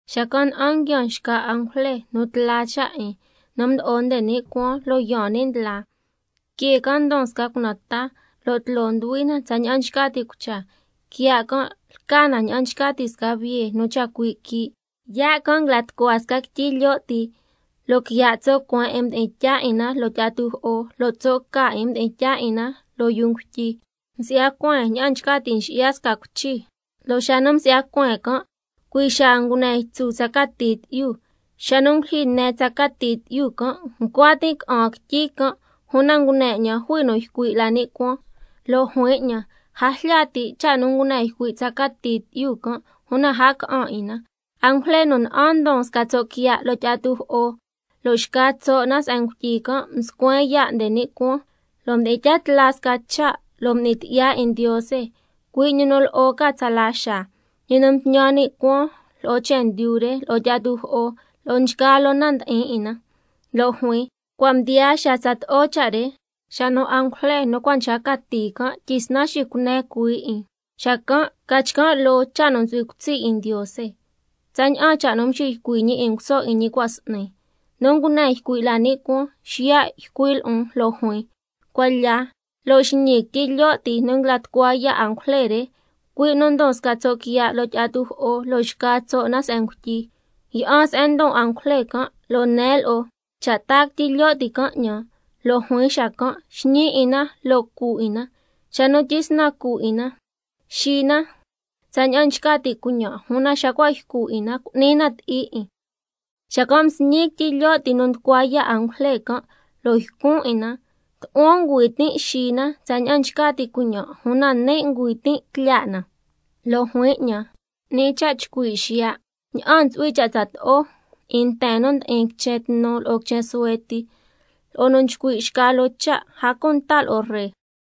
Xacan' na'an nguiaan xca angujle nu tla cha' 'in, nu mdo'o nde ni' cuaan, lo' yaan ni' ndla. Que can' ndon sca cunan taa, lo' tloo nduhui na tsaña'an nchca ti' cucha, quiya' can' lca na ña'an nchca ti' sca biye nu chacui' quii'. Yaa' can' nguila tucua sca quityi lyo' ti, lo' quiya' tso' cueen 'in mdi'in tyaa 'in na loo tyi'a tujo'o, lo' tso' ca 'in mdi'in tyaa 'in na loo yuu ngutyi. Msi'ya cueen ña'an nchca ti' nxi'ya sca cuichi, lo' xa nu msi'ya cueen can' cui' xaa ngune ytsu tsa cati tyi'yu. Xa nu ngulyijyi ne tsa cati tyi'yu can', ncua tin' ca'an quityi can', una ngune 'ñan jui nu ycui' la ni' cuaan, lo' juin 'ñan: A jlya ti' cha' nu ngune ycui' tsa cati tyi'yu can', una a ca'an 'in na. Angujle nu na'an ndon sca tso' quiya' loo tyi'a tujo'o lo' xca tso' na se'en ngutyi can', mscuen yaa' nde ni' cuaan, lo' mdi'in tya tla sca cha' lo' m'ni tyi'ya 'in Ndiose, cui' ñi nu lo'o ca tsala xaa, —ñi nu mtñan ni' cuaan lo'o chendyu re, lo'o tyi'a tujo'o lo'o nchgaa loo na nu ndi'in 'in na—, lo' juin: Cua' mdiyaa xaa tsato'o cha' re, xa nu angujle nu cua' nchca cati can' tyisnan xicune cuhuii 'in, xacan' ca chcan' loo cha' nu ntsu'hui cutsi' 'in Ndiose, tsaña'an cha' nu mxiycui' ñi 'in nguso 'in ñi cua' s'ni. Nu ngune ycui' la ni' cuaan, xiya' ycui' lo'on lo' juin: Cuan lya, lo' xñi quityi lyo' ti nu nguila tucua yaa' angujle re, cui' nu ndon sca tso' quiya' loo tyi'a tujo'o lo' xca tso' na se'en ngutyi. Yi'an se'en ndon angujle can', lo' nen lo'o cha' taa quityi lyo' ti can' 'ñan. Lo' juin xacan': Xñi 'in na lo' cu 'in na, xa nu tyisnan cu 'in na, xi na tsaña'an nchca ti' cuiñan', una xa cua' ycu 'in na, cu'ni na ti'i 'in. Xacan' msñin quityi lyo' ti nu nducua yaa' angujle can', lo' ycun 'in na, tu'huan ngüi tin' xi na tsaña'an nchca ti' cuiñan', una nin' ngüi tin' tlyaa' na. Lo' juin 'ñan: 'Ni cha' chcui' xiya' ña'an ntsu'hui cha' tsato'o 'in nten nu ndi'in quichen tnu lo'o quichen suhue ti, lo'o nu nchcui' xca loo cha', a cunta lo'o ree.